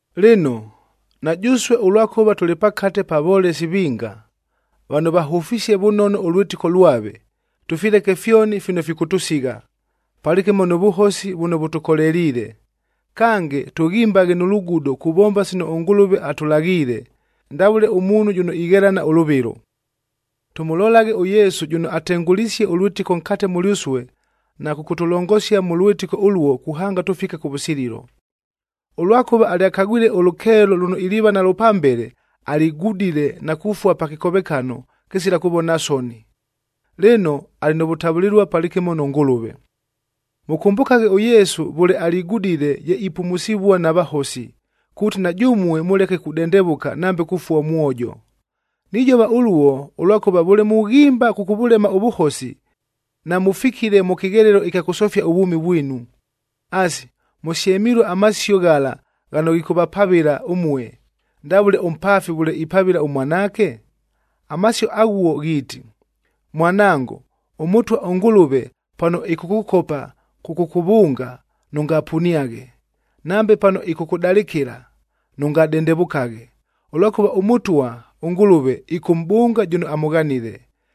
Lɨno, na jʉsue ʉlwakʉva tʉlɨ pakate pa volesi vinga, vano vahʉfisie vʉnono ʉlwɨtɨko lwave, tʉfileke fyoni fino fikʉtʉsigha, palɨkɨmo nʉ vʉhosi vʉno vʉtʉkoleliile. Kange, tʉghimbaghe nʉ lugudo kuvomba sino ʉNgʉlʉve atʉlaghiile, ndavʉle ʉmuunhu jʉno ighelana ʉlʉvɨlo. Tʉmʉlolaghe ʉYesu jʉno atengʉlisie ʉlwɨtɨko nkate mʉlyʉsue na kʉkʉtʉlongosia mʉ lwɨtɨko ʉluo kuhanga tʉfike kʉvʉsililo. Ʉlwakʉva alyakagwile ʉlʉkeelo lʉno iliiva nalwo pambele, aligudile na kufua pa kɨkovekano kɨsila kʉvona soni. Lɨno, alɨ nʉ vʉtavʉlɨlua palɨkɨmo nʉ Ngʉlʉve. Mʉkʉmbʉkaghe ʉYesu vʉle aligudile ye ipumusivua na vahosi, kuuti na jʉmue mʉleke kudendevʉka nambe kufua ʉmwojo. Nijova ʉluo, ʉlwakʉva vʉle mughimba kʉkʉvʉlema ʉvʉhosi, namʉfikile mʉ kɨghelelo ɨkya kʉsofia ʉvwʉmi vwinu. Asi, mʉsyemilue amasio ghala ghano ghikʉvapavɨla ʉmue, ndavʉle ʉmpaafi vʉle ipavɨla ʉmwanaake? Amasio aghuo ghiiti, “Mwanango, ʉMʉtwa ʉNgʉlʉve pano ɨkʉkʉkopa kʉkʉkʉvʉnga, nʉngapuniaghe. Nambe pano ɨkʉkʉdalɨkɨla, nʉngadendevʉkaghe. Ʉlwakʉva ʉMʉtwa ʉNgʉlʉve ɨkʉmʼbʉnga jʉno amʉghanile,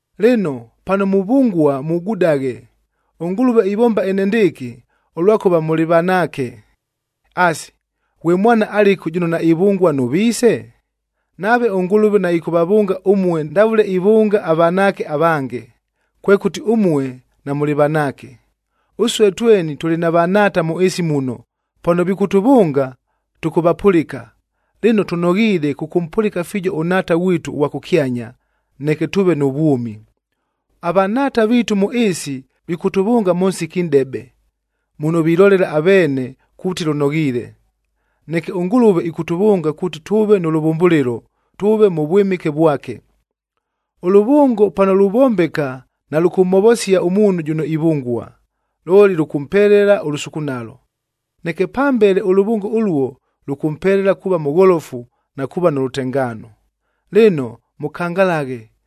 Lɨno, pano muvʉngua mugudaghe, ʉNgʉlʉve ivomba enendɨɨkɨ, ʉlwakʉva mʉlɨ vanaake. Asi, ghwe mwana alɨku jʉno naivʉngua nʉ viise? Nave ʉNgʉlʉve naɨkʉvavʉnga ʉmue ndavʉle ivʉnga avanaake avange, kwekʉti ʉmue namʉlɨ vanaake. Ʉsue tweni tʉlɨ na vanhaata mʉ ɨɨsi muno, pano vikʉtʉvʉnga, tʉkʉvapʉlɨka. Lɨno, tʉnoghiile kʉkʉmpʉlɨka fiijo ʉNhaata ghwitu ʉghwa kʉkyanya, neke tʉʉve nʉ vwʉmi. Avanhaata viitu mʉ ɨɨsi vikʉtʉvʉnga mʉ nsiki nʼdebe, muno vilolela aveene kuuti lʉnoghiile. Neke ʉNgʉlʉve ɨkʉtʉvʉnga kuuti tʉʉve nʉ lʉvʉmbʉlɨlo, tʉʉve mʉ vwɨmɨke vwake. Ʉlʉvʉngo pano luvombeka nalʉkʉmhovosia ʉmuunhu jʉno ivʉngua, looli lʉkʉmpelela ʉlʉsukunalo. Neke pambele ʉlʉvʉngo ʉluo, lʉkʉmpelela kuuva mʉgholofu na kuuva nʉ lʉtengaano. Lɨno mʉkangalaghe,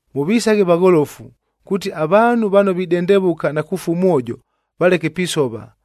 Mʉvisaghe vagholofu, kuuti avaanhu vano videndevʉka na kufua ʉmwojo valeke pisova,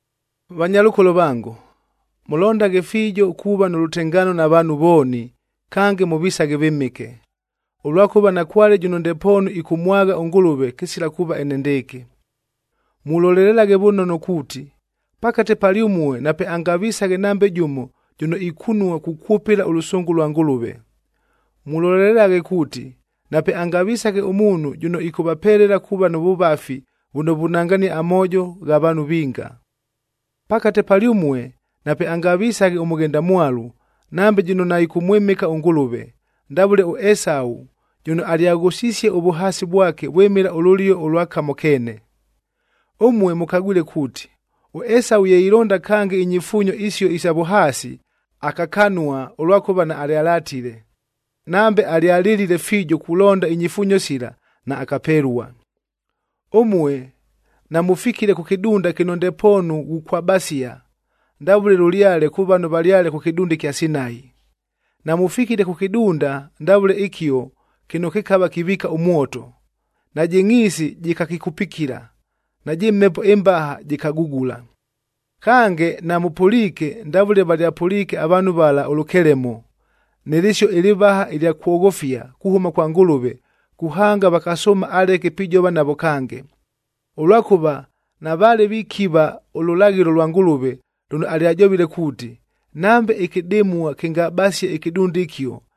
Vanyalʉkolo vango, mʉlondaghe fiijo kuuva nʉ lʉtengaano na vaanhu vooni kange mʉvisaghe vɨmɨke, ʉlwakʉva nakwale jʉno ndepoonu ɨkʉmwagha ʉNgʉlʉve kɨsila kuuva enendɨɨkɨ. Mulolelelaghe vʉnono kuuti, pakate palyʉmue napeangavisaghe nambe jʉmo jʉno ikunua kukwʉpɨla ʉlʉsʉngʉ lwa Ngʉlʉve. Mulolelelaghe kuuti, napeangavisaghe ʉmuunhu jʉno ɨkʉvapelela kuuva nʉ vʉvafi vʉno vunangania amoojo gha vaanhu vinga. Pakate palyʉmue napeangavisaghe ʉmʉghendamwalu, nambe jʉno naɨkʉmwɨmɨka ʉNgʉlʉve, ndavʉle ʉEsau jʉno alyaghʉsisie ʉvʉhaasi vwake vwɨmɨla ʉlʉlio ʉlwa kamo keene. Ʉmue mʉkagwile kuuti, ʉEsau ye ilonda kange inyifuunyo isio isa vʉhaasi, akakanua ʉlwakʉva naalyalatile. Nambe alyalɨlile fiijo kulonda inyifuunyo sila, naakapelua. Ʉmue namʉfikile kʉ kɨdunda kɨno ndepoonu ghukwabasia, ndavʉle lʉlyale kʉ vano valyale kʉ kɨdunda ɨkya Sinai. Namʉfikile kʉ kɨdunda ndavʉle ɨkio kɨno kɨkava kiviika ʉmwoto, najɨ ngʼhiisi jɨkakɨkupikila, najɨ mhepo ɨmbaha jɨkagugula. Kange, namʉpʉliike ndavʉle valyapʉliike avaanhu vala ʉlʉkelemo, nɨ lɨsio ɨlɨvaha ɨlya kwoghofia kuhʉma kwa Ngʉlʉve kuhanga vakasʉʉma aleke pijova navo kange, ʉlwakʉva navaale vikiva ʉlʉlaghɨlo lwa Ngʉlʉve lʉno alyajovile kuuti, “Nambe ɨkɨdɨmua kɨngabasie ɨkɨdunda ɨkio,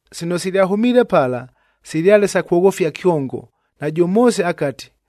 Sino silyahʉmiile pala, silyale sa kwoghofia kyongo, najʉ Moose akati,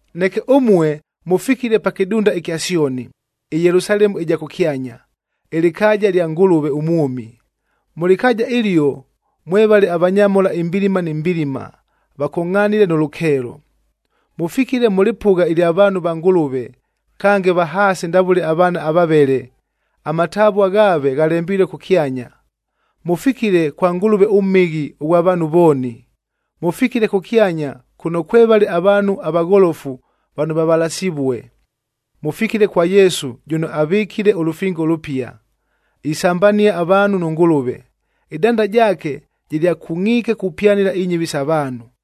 Neke ʉmue mʉfikile pa kɨdunda ɨkya Syoni, ɨYelusalemu ɨja kʉkyanya, ɨlɨkaaja lya Ngʉlʉve ʉmwʉmi. Mʉ lɨkaaja ɨlio mwevale avanyamhola imbilima ni mbilima, vakongʼhanile nʉ lʉkeelo. Mʉfikile mʉ lɨpʉgha ɨlya vaanhu va Ngʉlʉve, kange vahaasi ndavʉle avaana avavele, amatavua ghaave ghalembilue kʉkyanya. Mʉfikile kwa Ngʉlʉve ʉMhɨghi ghwa vaanhu vooni. Mʉfikile kʉkyanya kʉno kwevale avaanhu avagholofu vano vavalasivue. Mʉfikile kwa Yesu jʉno avɨkile ʉlʉfingo ʉlʉpia, isambania avaanhu nʉ Ngʉlʉve. Ɨdanda jaake jɨlyakungʼiike kupyanɨla inyɨvi sa vaanhu,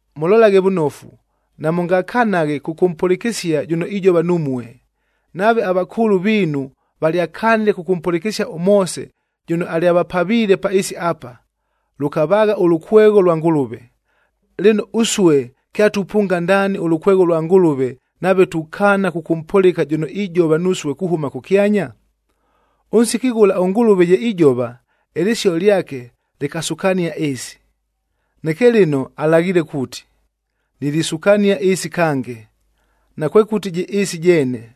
Mʉlolaghe vʉnofu, namʉngakanaghe kʉkʉmpʉlɨkɨsia jʉno ijova numue. Nave avakʉʉlʉ viinu valyakanile kʉkʉmpʉlɨkɨsia ʉMoose jʉno alyavapaviile pa ɨɨsi apa, lʉkavaagha ʉlʉkwegho lwa Ngʉlʉve; lɨno ʉsue kyatupʉnga ndaani ʉlʉkwegho lwa Ngʉlʉve, nave tukaana kʉkʉmpʉlɨka jʉno ijova nusue kuhʉma kʉkyanya? Ʉnsiki ghʉla ʉNgʉlʉve ye ijova, ɨlɨsio lyake lɨkasukania ɨɨsi. Neke lɨno alaghiile kuuti, “Nilisukania ɨɨsi kange, nakwekʉti jɨ ɨɨsi jeene,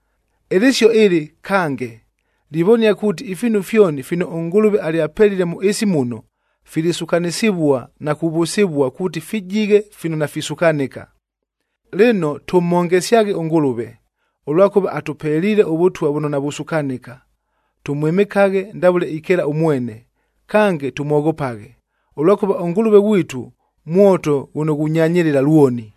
Ɨlɨsio ɨlɨ, “kange” livonia kuuti ifiinu fyoni fino ʉNgʉlʉve alyapelile mʉ ɨɨsi muno, filisukanɨsɨvua na kuvʉsɨvua, kuuti fijighe fino nafisukanɨka. Lɨno, tʉmhongesyaghe ʉNgʉlʉve, ʉlwakʉva atʉpeliile ʉvʉtwa vʉno navusukanɨka. Tʉmwɨmɨkaghe ndavʉle ikeela ʉmwene, kange tʉmwoghopaghe, ʉlwakʉva ʉNgʉlʉve ghwitu, mwoto ghʉno ghunyanyɨlɨla lwoni!